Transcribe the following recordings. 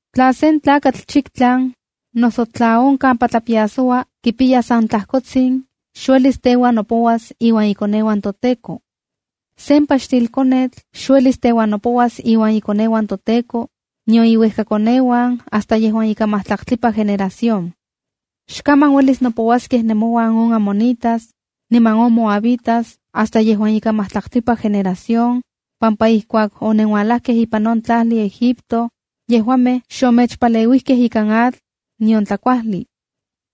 ’Tla sen eunuco, noso tla on kampa tlapiasoua kipiya san tlajkotsin, xuelis teuan nopouas iuan ikoneuan toTEKO. ’Sen paxtilkonetl xuelis teuan nopouas iuan ikoneuan toTEKO, nion iuejkakoneuan hasta yejuan ika majtlaktlipa generación. ’Xkaman uelis nopouaskej nemouan on amonitas, niman on moabitas, hasta yejuan ika majtlaktlipa generación, pampa ijkuak onenualejkej ipan on tlajli Egipto, yejuamej xomechpaleuijkej ikan atl, nion tlakuajli.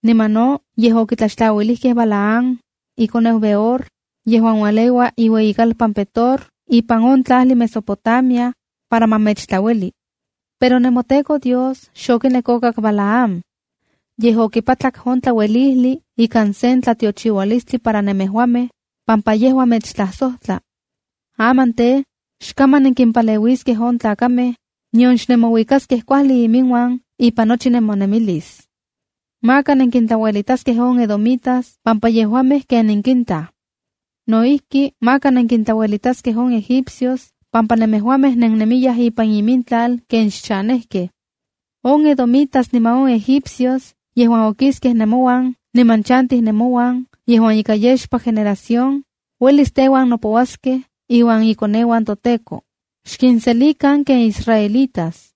Niman no, yej okitlaxtlauilijkej Balaam, ikoneu Beor, yejuan ualeua iueyikalpan Petor ipan on tlajli Mesopotamia, para ma mechtlaueli. Pero nemoTEKO Dios xokinek okak Balaam. Yej okipatlak on tlauelijli ikan sen tlatiochiualistli para nemejuamej, pampa yejua mechtlajsojtla. Aman tej, xkaman nenkimpaleuiskej on tlakamej, nion xnemouikaskej kuajli iminuan ipan nochi nemonemilis. ’Maka nenkintlauelitaskej on edomitas pampa yejuamej ken nenkintaj. No ijki, maka nenkintlauelitaskej on egipcios pampa nemejuamej nennemiyaj ipan imintlal ken xchanejkej. On edomitas niman on egipcios yejuan okiskej nemouan niman chantij nemouan yejuan ika yexpa generación, uelis teuan nopouaskej iuan ikoneuan toTEKO. Xkinselikan ken israelitas.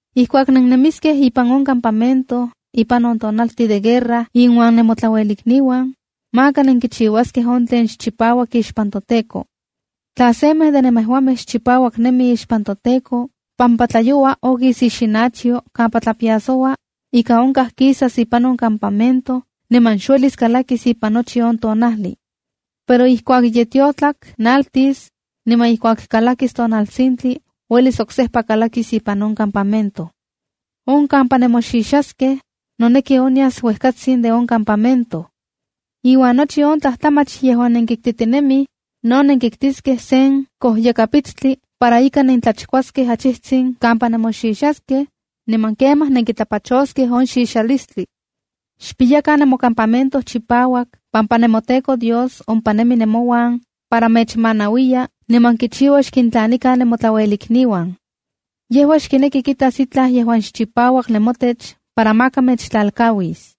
’Ijkuak nennemiskej ipan on campamento ipan on tonaltin de guerra inuan nemotlaluelikniuan, maka nenkichiuaskej on tlen xchipauak ixpan toTEKO. Tla semej de nemejuamej xchipauak nemi ixpan toTEKO pampa tlayoua okis ixinachyoa kampa tlapiasoua, ika onkaj kisas ipan on campamento niman xuelis kalakis ipan nochi on tonajli. Pero ijkuak ye tiotlak naltis, niman ijkuak kalakis tonaltsintli uelis oksejpa kalakis ipan on campamento. ’On kampa nemoxixaskej, noneki onyas uejkatsin de on campamento. Iuan nochi on tlajtlamach yejuan nenkiktitinemij, no nenkiktiskej sen kojyakapitstli para ika nentlachkuaskej achijtsin kampa nemoxixaskej niman kemaj nenkitlapachoskej on xixalistli. Xpiyakan nemocampamento chipauak pampa nemoTEKO Dios ompa nemi nemouan para mechmanauiya niman kichiua xkintlanikan nemotlauelikniuan. Yejua xkineki kitas itlaj yejuan xchipauak nemotech para maka mechtlalkauis.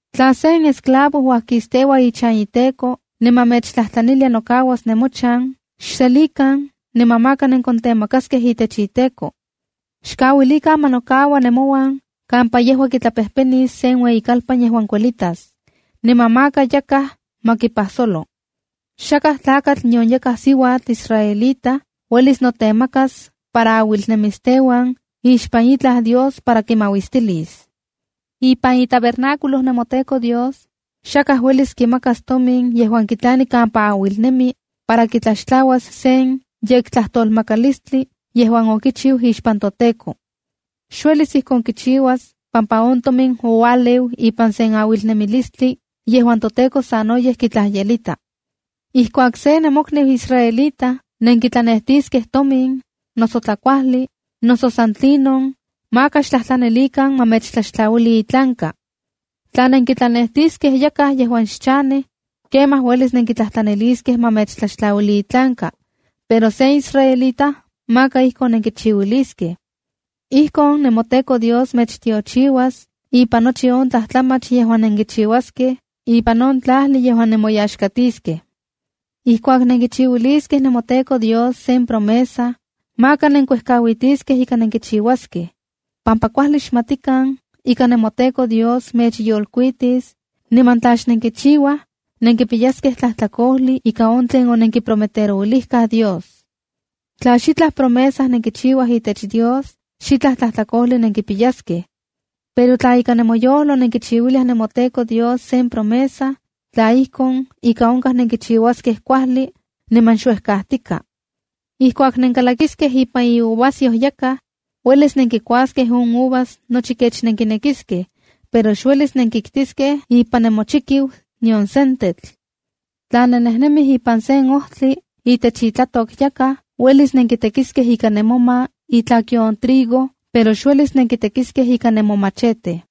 ’Tla sen esclavo uajkisteua ichan iteko niman mechtlajtlanilia nokauas nemochan, xselikan niman maka nenkontemakaskej itech iteko. Xkauilikan ma nokaua nemouan kampa yejua kitlapejpenis sen ueyikalpan yejuan kuelitas. Niman maka yakaj ma kipajsolo. ’Xakaj tlakatl nion yakaj siuatl israelita uelis notemakas para auilnemis teuan ixpan itlaj dios para kimauistilis. Ipan itabernáculo nemoTEKO Dios, xakaj uelis kimakas tomin yejuan kitlani kampa auilnemi, para kitlaxtlauas sen yektlajtolmakalistli yejuan okichiu ixpan toTEKO. Xuelis ijkon kichiuas pampa on tomin oualeu ipan sen auilnemilistli yejuan toTEKO sanoyej kitlajyelita. ’Ijkuak sen nemokniu israelita nenkitlanejtiskej tomin, noso tlakuajli, noso san tlinon, maka xtlajtlanilikan ma mechtlaxtlauili itlanka. Tla nenkitlanejtiskej yakaj yejuan xchanej, kemaj uelis nenkitlajtlaniliskej ma mechtlaxtlaluili itlanka, pero sen israelita maka ijkon nenkichiuiliskej. Ijkon nemoTEKO Dios mechtiochiuas ipan nochi on tlajtlamach yejuan nenkichiuaskej ipan on tlajli yejuan nemoyaxkatiskej. ’Ijkuak nenkichiuiliskej nemoTEKO Dios sen promesa, maka nenkuejkauitiskej ika nenkichiuaskej, pampa kuajli xmatikan ika nemoTEKO Dios mechyolkuitis, niman tla xnenkichiuaj nenkipiyaskej tlajtlakojli ika on tlen onenkiprometerouilijkaj Dios. Tla xitlaj promesa nenkichiuaj itech Dios, xitlaj tlajtlakojli nenkipiyaskej. Pero, tla ika nemoyojlo nenkichiuiliaj nemoTEKO Dios sen promesa, tla ijkon, ika onkaj nenkichiuaskej kuajli niman xuejkajtika. ’Ijkuak nenkalakiskej ipan iuvasyoj yakaj, uelis nenkikuaskej on uvas nochi kech nenkinekiskej, pero xuelis nenkiktiskej ipan nemochikiu nion sentetl. Tla nennejnemij ipan se ojtli itech itlatok yakaj, uelis nenkitekiskej ika nemoma itlakyo on trigo, pero xuelis nenkitekiskej ika nemomachete.